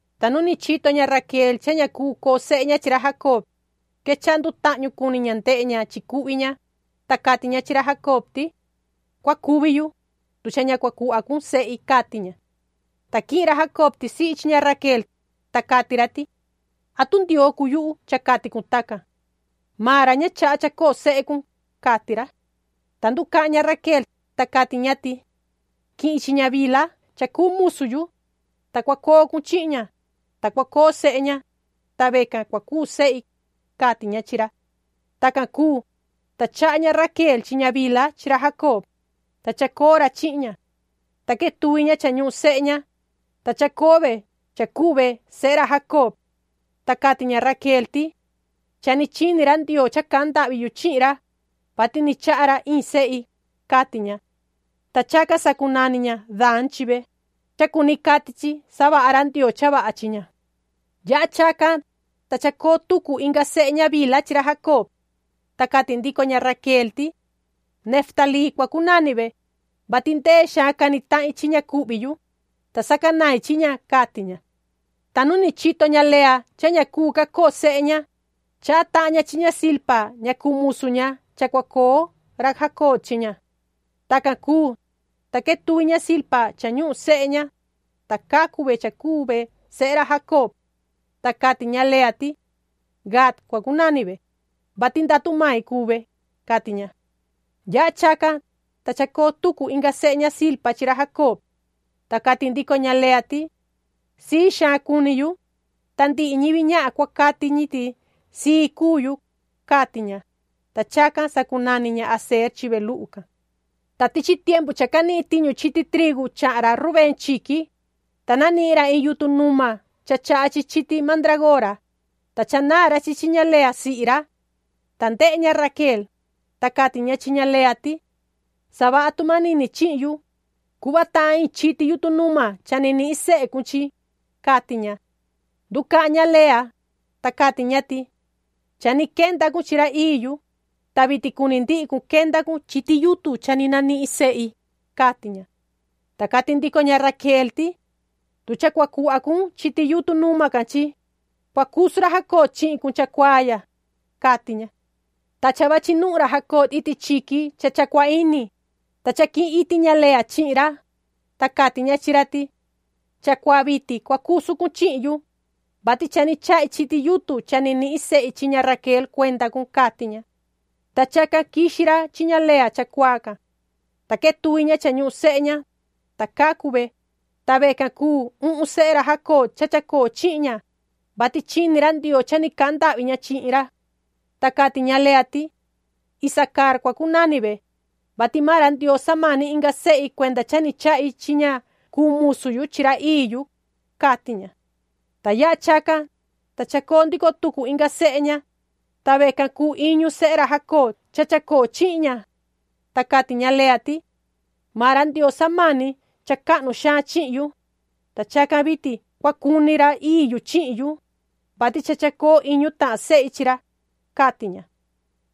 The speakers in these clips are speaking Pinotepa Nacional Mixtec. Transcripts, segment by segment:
Ta nu ni chito ña Raquel cha ña cuu coo sehe ña chi ra Jacob, quechaha ndutahñu cuni ña ndehe ña chi cuhvi ña, ta cati ña chi ra Jacob ti: ―Cua cuvi yu, tu cha ña cua cuhva cun sehi ―cati ña. Ta quihin ra Jacob tisihi chi ña Raquel, ta cati ra ti: ―¿Atu Ndioo cuu yuhu cha cati cun tacan? Maan ra ña chaha chacoo sehe cun ―cati ra. Ta nducahan ña Raquel, ta cati ña ti: ―Quihin chi ña Bilha cha cuu musu yu, ta cua coo cun chihin ña, ta cua coo sehe ña, ta vecan cua cuu sehi ―cati ña chi ra. Tacan cuu, ta chaha ña Raquel chi ña Bilha chi ra Jacob, ta chacoo ra chihin ña. Ta quetuvi ña cha ñuhun sehe ña, ta chacoo ve cha cuu ve sehe ra Jacob. Ta cati ña Raquel ti: “Cha ni chini ra Ndioo cha cahan ndahvi yu chihin ra, vati ni chaha ra iin sehi”, cati ña. Ta chacan sacunani ña Dan chi ve, cha cuni cati chi”savaha ra Ndioo cha vaha chi ña”. Yaha chacan, ta chacoo tucu inga sehe ña Bilha chi ra Jacob. Ta cati ndico ña Raquel ti: “Neftalí cua cunani ve, vati ndee xaan cani tahin chi ña cuhvi yu, ta sacanain chi ña”, cati ña. Ta nu ni chito ña Lea cha ña cuu ca coo sehe ña, chaha tahan ña chi ña Zilpa ña cuu musu ña cha cua coo ra Jacob chi ña. Tacan cuu, ta quetuvi ña Zilpa cha ñuhun sehe ña, ta cacu ve cha cuu ve sehe ra Jacob. Ta cati ña Lea ti:” Gad cua cunani ve, vati ndatu mai cuu ve”, cati ña. Yaha chacan, ta chacoo tucu inga sehe ña Zilpa chi ra Jacob. Ta cati ndico ña Lea ti:” Sii xaan cuni yu, ta ndihi ñivi ñahan cua cati ñi ti sii cuu yu”, cati ña. Ta chacan sacunani ña Aser chi ve luhu can. Ta tichi tiempu cha canihin tiñu chiti trigu chahan ra Rubén chiqui, ta nanihin ra iin yutun numa cha chaha chiti mandraagora, ta chanaan ra chi chi ña Lea sihi ra. Ta ndehe ña Raquel, ta cati ña chi ña Lea ti: ―Savaha tu manini chihin yu, cuhva tahan iin chiti yutun numa cha ni nihin sehe cun chi ―cati ña. Nducahan ña Lea, ta cati ña ti: ―Cha ni quenda cun chi ra ii yu, ta vitin cuni ndihi cun quenda cun chiti yutun cha ni nanihin sehi ―cati ña. Ta cati ndico ña Raquel ti: ―Tu cha cua cuhva cun chiti yutun numa can chi, cua cusu ra Jacob chihin cun chacuaa ya ―cati ña. Ta cha vachi nuhun ra Jacob iti chiqui cha cha cua ini, ta cha quihin iti ña Lea chihin ra, ta cati ña chi ra ti: ―Chacuaa vitin cua cusu cun chihin yu, vati cha ni chahi chiti yutun cha ni nihin sehi chi ña Raquel cuenda cun ―cati ña. Ta chacan quixi ra chi ña Lea chacuaa can. Ta quetuvi ña cha ñuhun sehe ña, ta cacu ve, ta vecan cuu uhun sehe ra Jacob cha chacoo chihin ña, vati chini ra Ndioo cha ni cahan ndahvi ña chihin ra. Ta cati ña Lea ti: “Isacar cua cunani ve, vati maan ra Ndioo samani inga sehi cuenda cha ni chahi chi ña cuu musu yu chi ra ii yu”, cati ña. Ta yaha chacan, ta chacoo ndico tucu inga sehe ña, ta vecan cuu iñu sehe ra Jacob cha chacoo chihin ña. Ta cati ña Lea ti: “Maan ra Ndioo samani cha cahnu xaan chihin yu, ta chacan vitin cua cuni ra ii yu chihin yu, vati cha chacoo iñu tahan sehi chi ra”, cati ña.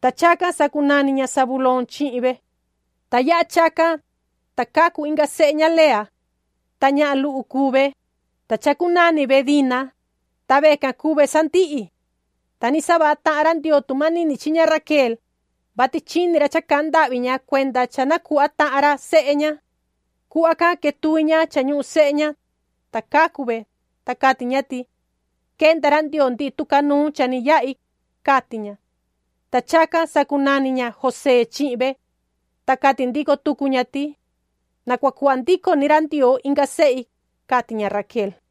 Ta chacan sacunani ña Zabulón chihin ve. Ta yaha chacan, ta cacu inga sehe ña Lea. Ta ñahan luhu cuu ve, ta chacunani ve Dina, ta vecan cuu ve sandihi. Ta ni savaha tahan ra Ndioo tu manini chi ña Raquel, vati chini ra cha cahan ndahvi ña cuenda cha na cuhva tahan ra sehe ña. Cuhva can quetuvi ña cha ñuhun sehe ña, ta cacu ve, ta cati ña ti:” Quenda ra Ndioo ndihi tucanuun cha ni yahi”, cati ña. Ta chacan sacunani ña José chihin ve. Ta cati ndico tucu ña ti: “Na cua cuhva ndico ni ra Ndioo inga sehi”, cati ña Raquel.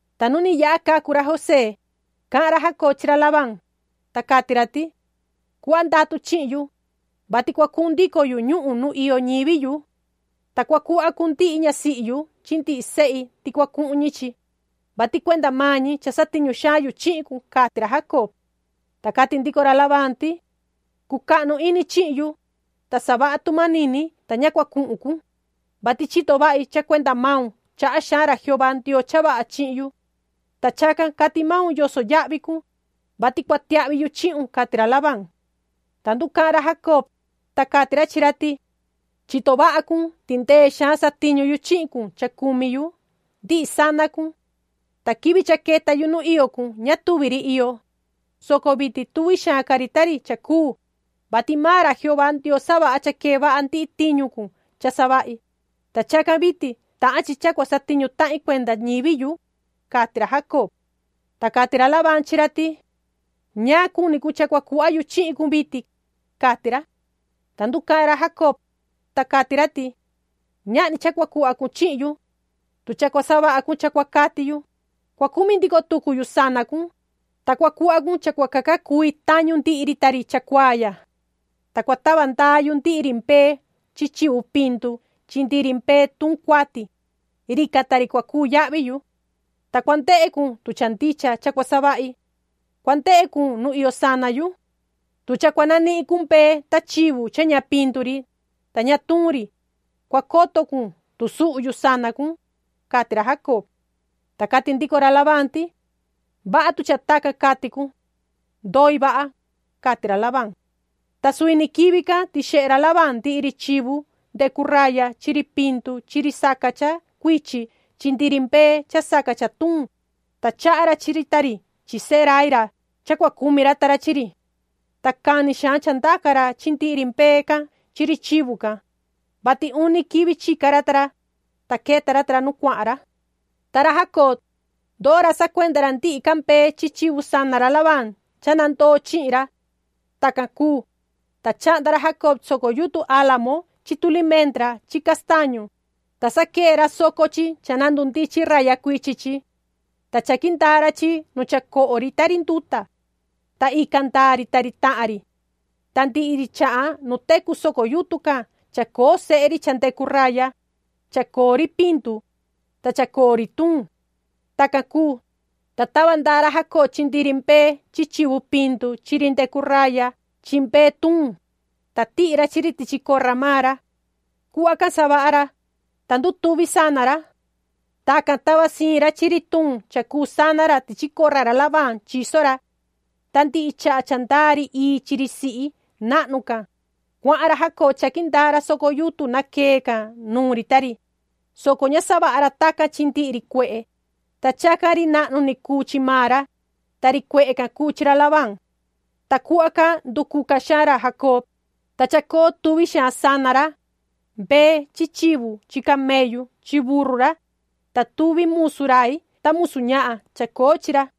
Ta nu ni yaha cacu ra José, cahan ra Jacob chi ra Labán, ta cati ra ti: ―Cuhva ndatu chihin yu, vati cua cuhun ndico yu ñuhun nu iyo ñivi yu. Ta cua cuhva cun ndihi ñasihi yu chi ndihi sehi ti cua cuhun ñi chi, vati cuenda maan ñi cha satiñu xaan yu chihin cun ―cati ra Jacob. Ta cati ndico ra Labán ti: ―Cucahnu ini chihin yu, ta savaha tu manini ta ña cuhun cun, vati chito vahi cha cuenda maun chaha xaan ra Jehová Ndioo cha vaha chihin yu. Ta chacan cati maun yoso yahvi cun, vati cua tiahvi yu chihun ―cati ra Labán. Ta nducahan ra Jacob, ta cati ra chi ra ti: ―Chito vaha cun ti ndee xaan satiñu yu chihin cun cha cumi yu ndihi sana cun. Ta quivi cha queta yu nu iyo cun ña tuvi ri iyo, soco vitin tuvi xaan ca ri ta ri cha cuu, vati maan ra Jehová Ndioo savaha cha quee vaha ndihi tiñu cun cha savahi, ta chacan vitin tahan chi cha cua satiñu tahin cuenda ñivi yu ―cati ra Jacob. Ta cati ra Labán chi ra ti: ―¿Ñaan cuni cun cha cua cuhva yu chihin cun vitin? ―cati ra. Ta nducahan ra Jacob, ta cati ra ti: ―Ñahni cha cua cuhva cun chihin yu. Tu cha cua savaha cun cha cua cati yu, cua cumi ndico tucu yu sana cun, ta cua cuhva cun cha cua caca cui tañu ndihi ri ta ri chacuaa ya. Ta cua tava ndaa yu ndihi ri mbee chi chivu pindu chi ndihi ri mbee tuun cuati, rican ta ri cua cuu yahvi yu. Ta cua ndehe cun tu cha ndicha cha cua savahi. Cua cundehe cun nu iyo sana yu. Tu cha cua nanihin cun mbee ta chivu cha ña pindu ri, ta ña tuun ri, cua coto cun tu suhu yu sana cun ―cati ra Jacob. Ta cati ndico ra Labán ti: ―Vaha tu cha tacan cati cun. Ndoi vaha ―cati ra Labán. Ta suvi ni quivi can tixehe ra Labán ndihi ri chivu ndecu raya chi ri pindu chi ri saca cha cuichin chi ndihi ri mbee cha saca cha tuun, ta chaha ra chi ri ta ri chi sehe rai ra cha cua cumi ra ta ra chi ri. Ta cani xaan cha ndaca ra chi ndihi ri mbee can chi ri chivu can, vati uni quivi chica ra ta ra, ta queta ra nu cuahan ra. Ta ra Jacob, ndoo ra sacuenda ra ndihi ca mbee chi chivu sana ra Labán cha nandoo chihin ra. Tacan cuu, ta chahnda ra Jacob soco yutun álamo chi tulimendra chi castañu, ta saquee ra soco chi cha na ndundichin raya cuichi chi. Ta chaqui ndaa ra chi nu cha coho ri ta ri nduta. Ta ican ndaa ri ta ri tahan ri. Ta ndihi ri chahan nu tecu soco yutun can chacoo sehe ri cha ndecu raya, chacoo ri pindu, ta chacoo ri tuun. Tacan cuu, ta tava ndaa ra Jacob chi ndihi ri mbee chi chivu pindu chi ri ndecu raya chi mbee tuun, ta tihi ra chi ri tichi corra maan ra. Cuhva can savaha ra, ta ndutuvi sana ra. Tacan tava siin ra chi ri tuun cha cuu sana ra tichi corra ra Labán chiso ra. Ta ndihi chaha cha ndaa ri ii chi ri sihi nahnu can, cuahan ra Jacob chaqui ndaa ra soco yutun naquee can nuun ri ta ri, soco ña savaha ra tacan chi ndihi ri cuehe. Ta chacan ri nahnu ni cuu chi maan ra, ta ri cuehe can cuu chi ra Labán. Ta cuhva can nducuca xaan ra Jacob, ta chacoo tuvi xaan sana ra, mbee chi chivu chi camellu chi burru ra, ta tuvi musu rai ta musu ñahan chacoo chi ra.